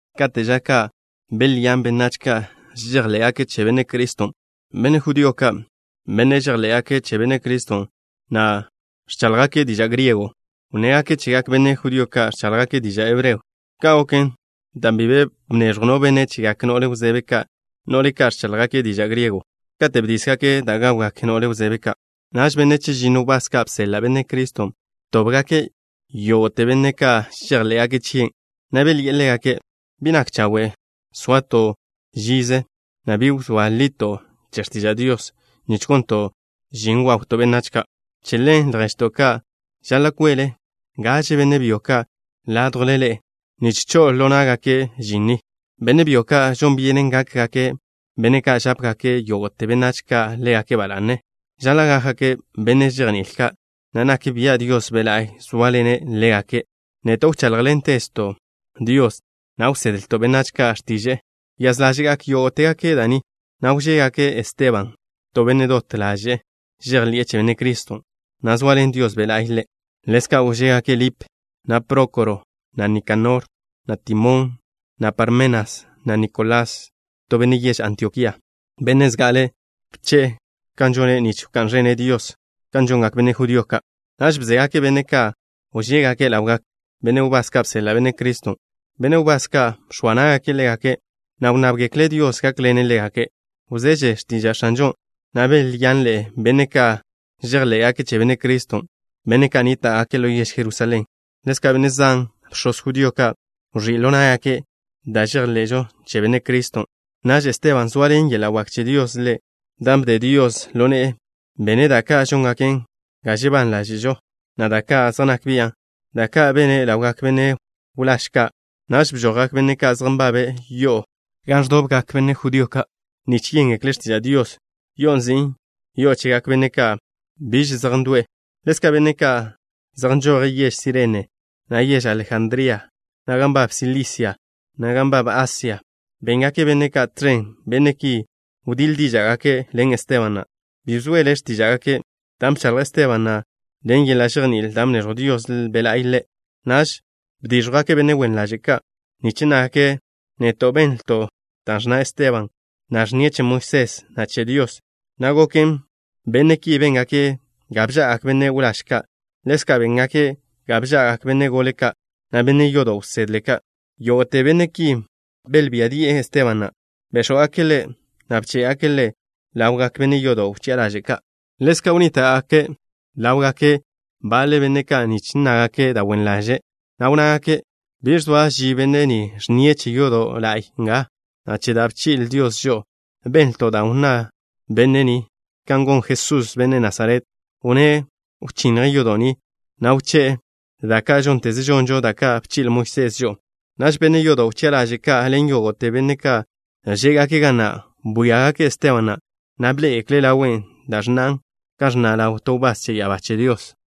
Kate' ža ka', belyán benách ka' žejḻé'gake' che Benne' Criston'. Benne' judío ka', benne' žejḻé'gake' che Benne' Criston', na' ẕcháḻjgake' diža' griego, wnnégake' chegak benne' judío ka' ẕcháḻjgake' diža' hebreo. Ka' goken dan' bi be bneẕjw no benne' chegak no'le wzebe ka', no'le ka' ẕcháḻjgake' diža' griego, katen' bdísgake' da' gawgak no'le wzebe ka'. Naž benne' chežinno wbás ka' bseḻa' Benne' Criston' btóbgake' yógo'te benne' ka' žejḻé'gake' chie', na' belyi'e ḻégake': —Bi nak chawe' soato' žize, na' bi wzóa lito' che x̱tiža' Dios, nich gonto' žin wawto' benách ka'. Che ḻen, lježto' ka', žaḻa' kwele gaže benne' byo ka' ládjwle ḻe'e nich ko'ožo ḻo ná'gake' žin ni. Benne' byo ka', žon byenen gákgake' benne' ka' žápegak yógo'te benách ka' ḻégake' ba la'ne. Žaḻa' gákgake' benne' žejní'il ka', na' nak bia' Dios Be' La'y zóaḻene' ḻégake'. Neto' wcháḻjḻentezto' Dios, na' wsedlto' benách ka' x̱tiže'e. Wyáz ḻáže'gak yógo'tegake' da' ni, na' wžégake' Esteban, to benne' dot ḻaže'e žejḻi'e che Benne' Criston', na' zoaḻen Dios Be' La'y ḻe'. Ḻezka' wžégake' Lip, na' Prókoro, na' Nikanor, na' Timón, na' Parmenas, na' Nikolás, to benne' yež Antiokía, benne' zga'ale bche'e kan žone' nich wká'n ẕene' Dios kan žongak benne' judío ka'. Naž bzégake' benne' ka' wžégake' ḻawgak benne' wbás ka' bseḻa' Benne' Criston'. Benne' wbás ka' bx̱oa ná'gake' ḻégake', na' wnnábgekle' Dios gákḻene' ḻégake'. Wzeže x̱tiža' X̱anžon', na' belyanḻe'e benne' ka' žejḻé'gake' che Benne' Criston', benne' ka' nníta'gake' ḻo yež Jerusalén. Ḻezka' benne' zan, bx̱oz judío ka', wẕí' ḻo ná'gake' da' žejḻe'žo che Benne' Criston'. Naž Esteban, zoaḻen yeḻa' wak che Dios ḻe', dan' bde Dios ḻo ne'e, bene' da' ka' žóngaken ga žebán ḻáže'žo, na' da' ka' zej nak bian', da' ka' bene' ḻawgak benne' wláž ka'. Naž bžojgak baḻe benne' ka' zej nbabe' yo'o gan ẕdobgak benne' judío ka' nich yéngekle' x̱tiža' Dios, yo'on' nzin' Yo'o Chegak Benne' Ka' Biž Zej Ndo'e. Ḻezka' benne' ka' zej nžoje' yež Sirene, na' yež Alejandría, na' gan nbab Silisia, na' gan nbab Asia, béngake' benne' ka' tẕen. Benne' ki wdíḻ díža'gake' ḻen Esteban na'. Bi bzoele x̱tíža'gake', dan' bchaḻj Esteban na' ḻen yeḻa' žejní'il dan' bneẕjw Dios Be' La'y ḻe'. Naž bdíẕjwgake' benne' wen ḻaže' ka', nich nnágake': “Neto' benlto' da' ẕnna Esteban na', ẕnnie' che Moisés, na' che Dios.” Ka' goken, benne' ki béngake' ga bža'agak benne' wláž ka'. Ḻezka' béngake' ga bža'agak benne' gole ka', na' benne' yodo' wsedle ka'. Yógo'te benne' ki belbía di'e Esteban na'. Béx̱wgake' ḻe', na' bché'gake' ḻe' ḻawgak benne' yodo' wchi'a ḻaže' ka'. Ḻezka' bnníta'gake' ḻáwgake' baḻe benne' ka' nich nnágake' da' wen ḻaže', na' wnnágake': —Bi zoa ži benne' ni ẕnnie' che yodo' la'y nga, na' che da' bchi'le Dios žo'o. Benlto' da' wnná benne' ni kan gon Jesús, benne' Nasaret. Wnné' wchinnje' yodo' ni, na' wché'e da' ka' žónteze žonžo, da' ka' bchi'le Moisés žo'o. Naž benne' yodo' wchi'a ḻaže' ka' ḻen yógo'te benne' ka' žé'gake' ga na', bwíagake' Esteban na', na' bḻé'egekle' ḻawe', da' ẕnnan' kan ẕnna' ḻaw to wbás che ya'abá che Dios.